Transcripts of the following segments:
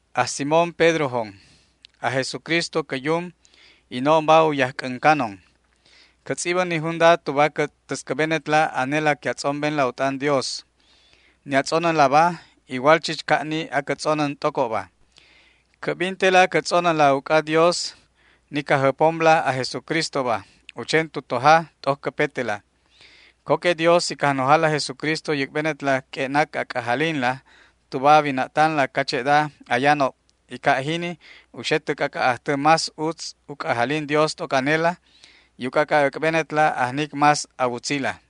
Aj Simón Pedrojon. Aj Jesucristo cä Yum, y no'onba u yajc'äncanon. Cä tz'ibän ni junda tuba cä täscäbenetla anela que a tz'ombenla u t'an Dios. Ni a tz'onänlaba igual chich ca' ni acä tz'onän t'ocobba. Cä'bintela cä tz'onänla uc'a Dios, ni Cajjäpomla aj Jesucristoba, u chen tu toja t'oc cäpetela. Co que Dios y Cajnojala aj Jesucristo u yäc'benetla q'ue'nac a c'ajalinla tuba a wina'tanla cache'da ayanob, y ca' jini u xe tä c'ac'a' ajtä más utz u c'ajalin Dios t'oc anela y u c'ac'a' äc'benetla ajnic más a wutzila.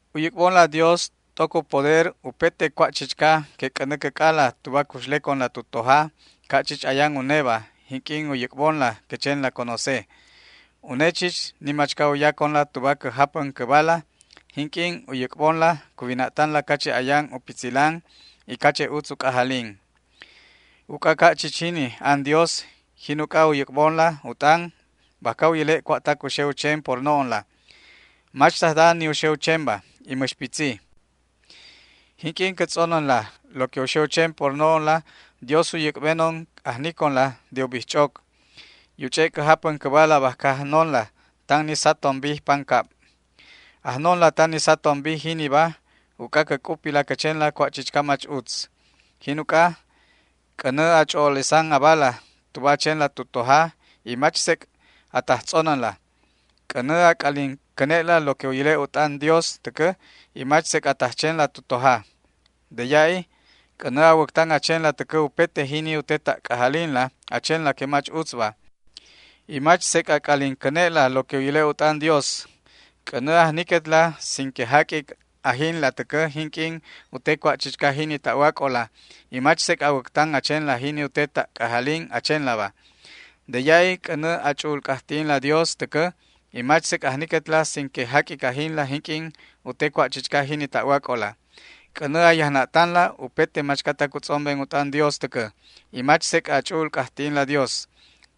U yäc'bonla Dios t'oc u poder upete cua' chichca que c'änä cäc'ala tuba cuxleconla tu toja ca' chich ayan uneba jinq'uin u yäc'bonla cä chenla conoce. Une chich ni machca u yaconla tuba cä japän cäbala jinq'uin u yäc'bonla cuwina'tanla cache' ayan u pitzilan y cache' utz u c'ajalin. Uc'a ca' chich jini an Dios, jin uc'a u yäc'bonla u t'an bajca u yäle' cua'tac u xe u chen por no'onla. Mach tajda ni u xe u chenba y mäx pitzi. Jinq'uin cä tz'onänla lo que u xe u chen por no'onla Dios u yäc'benon ajniconla de u bijch'oc, y u ch'e' cä japän cäbala bajca ajnonla tan ni satom bij pancab. Ajnonla tan ni satom bij jiniba uc'a cä c'upi cä chenla cua' chichca mach utz. Jin uc'a c'änä a ch'o'olesan abala tuba a chenla tu toja y mach sec' a taj tz'onänla. C'änä a c'alin cäne'la lo que u yäle' u t'an Dios täcä y mach sec' a taj chenla tu toja. De ya'i c'änä a wäctan a chenla täcä upete jini u te ta' c'ajalinla a chenla que mach utzba, y mach sec' a c'alin cäne'la lo que u yäle' u t'an Dios. C'änä ajniquetla sin que jaq'uic ajinla täcä jinq'uin u te cua' chichca jini ta'wac'ola y mach sec' a wäctan a chenla jini u te ta' c'ajalin a chenlaba. De ya'i c'änä a ch'u'ul c'ajti'inla Dios täcä y mach sec' ajniquetla sin que jaq'uic ajinla jinq'uin u te cua' chichca jini ta'wac'ola. C'änä a yajna'tanla upete machcatac u tz'omben u t'an Dios täcä y mach sec' a ch'u'ul c'ajti'inla Dios.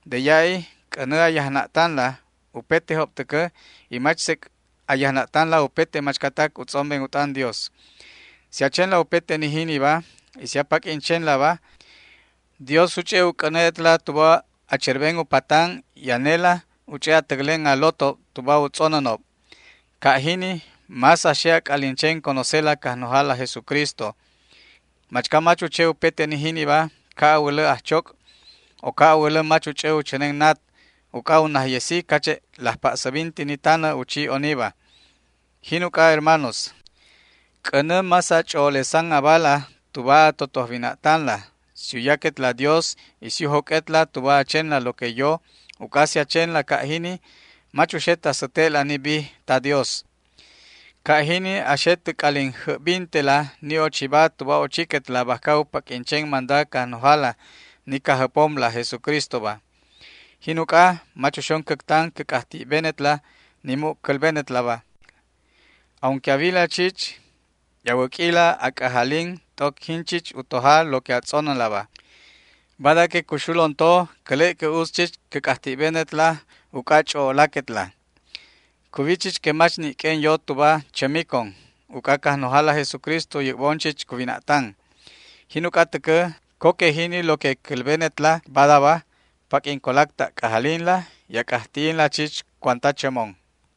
De ya'i c'änä a yajna'tanla upetejob täcä y mach sec' a yajna'tanla upete machcatac u tz'omben u t'an Dios. Si a chenla upete ni jiniba y si a paq'uin chenlaba, Dios u ch'e' u c'äne'etla tuba a cherben u patan y anela u ch'e' a täclen a lotob tuba u tz'onänob. Ca' jini más a xe a c'alin chen conocela Cajnojala aj Jesucristo. Machca mach u che upete ni jiniba ca' a wälä ajchoc', o ca' a wälä mach u ch'ä u chänen nat, uc'a u najyesi cache' laj pa'säbinti ni tanä u chi oniba. Jin uc'a, hermanos, c'änä más a ch'o'olesan abala tuba a totoj wina'tanla si u yaquetla Dios y si u joq'uetla tuba a chenla lo que yo, uc'a si a chenla ca' jini mach uxet a säte'la ni bij ta Dios. Ca' jini a xe tä c'alin jäbbintela ni ochiba tuba ochiquetla bajca u paq'uin chen manda Cajnojala ni Cajjäpomla aj Jesucristoba. Jin uc'a mach uxon cäctan cä c'ajti'benetla ni mu' cälbenetlaba, aunque a wila chich y a wäq'uila a c'ajalin t'oc jin chich u toja lo que a tz'onänlaba. Bada que cuxulon to cäle' que utz chich cä c'ajti'benetla uc'a ch'o'olaquetla. Cuwi chich que mach ni' q'uen yo tuba chämicon, uc'a Cajnojala aj Jesucristo u yäc'bon chich cuwina'tan. Jin uc'a täcä, co que jini lo que cälbenetla badaba paq'uin colac ta' c'ajalinla y a c'ajti'inla chich cuanta chämon.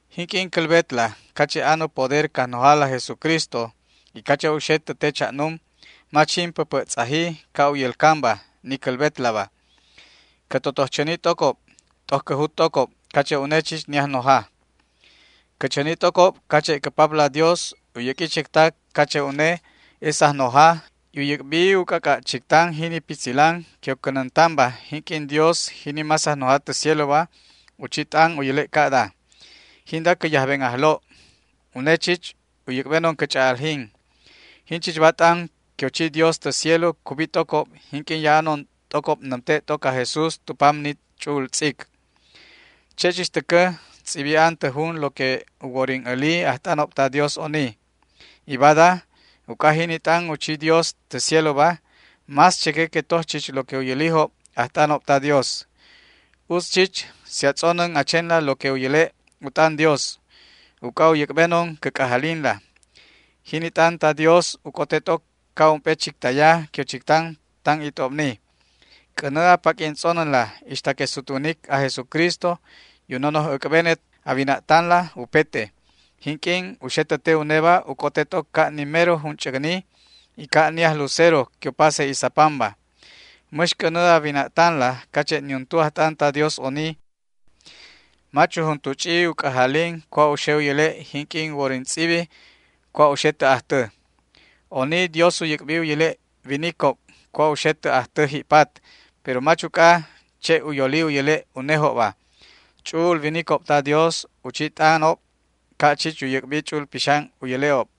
Jinq'uin cälbetla cache' an u poder Cajnojala aj Jesucristo y cache' u xe tä te cha'num, mach jin päpä' tz'aji ca' u yälcanba ni cälbetlaba. Cä totoj chäni t'ocob t'oc cä jut t'ocob cache' une chich ni Ajnoja. Cä chäni t'ocob cache' cä Papla Dios u yäq'ui chectac cache' une es Ajnoja, y u yäc'bi u c'ac'a' chictan jini pitzilan que u cänäntanba jinq'uin Dios, jini más Ajnoja tä cieloba, u chi t'an u yäle' ca'da: “Jinda cä yajben Ajlo'. Une chich u yäc'benon cä ch'a'aljin”. Jinchichba t'an que u chi Dios tä cielo cubi t'ocob jinq'uin ya'anon t'ocob nämte' t'oc aj Jesús tu pam ni ch'u'ul tz'ic. Che' chich täcä tz'ibi an tä jun lo que u worin äli ajt'anob ta Dios oni. Y bada, uc'a jini t'an u chi Dios tä cieloba, más cheque que toj chich lo que u yälijob ajt'anob ta Dios. Utz chich si a tz'onän a chenla lo que u yäle' u t'an Dios, uc'a u yäc'benon cä c'ajalinla. Jini t'an ta Diosba u c'ote t'oc ca' ump'e chictaya que u chictan tan it'obni. C'änä a paq'uin tz'onänla ixta que sutwanic aj Jesucristo y u nonoj äc'benet a wina'tanla upete. Jinq'uin u xe tä te uneba u c'ote t'oc ca' ni mero junch'äcni y ca' ni ajlucero que u pase isapanba. Mäx c'änä a wina'tanla cache' niuntu ajt'an ta Dios oni mach u juntu ch'i u c'ajalin cua' u xe u yäle' jinq'uin u worin tz'ibi cua' u xe tä ajtä. Oni Dios u yäc'bi u yäle' winicob cua' u xe tä ajtä ji'pat, pero mach uc'a che' u yoli u yäle' unejobba. Ch'u'ul winicob ta Dios u chi t'anob ca' chich u yäc'bi Ch'u'ul Pixan u yäle'ob.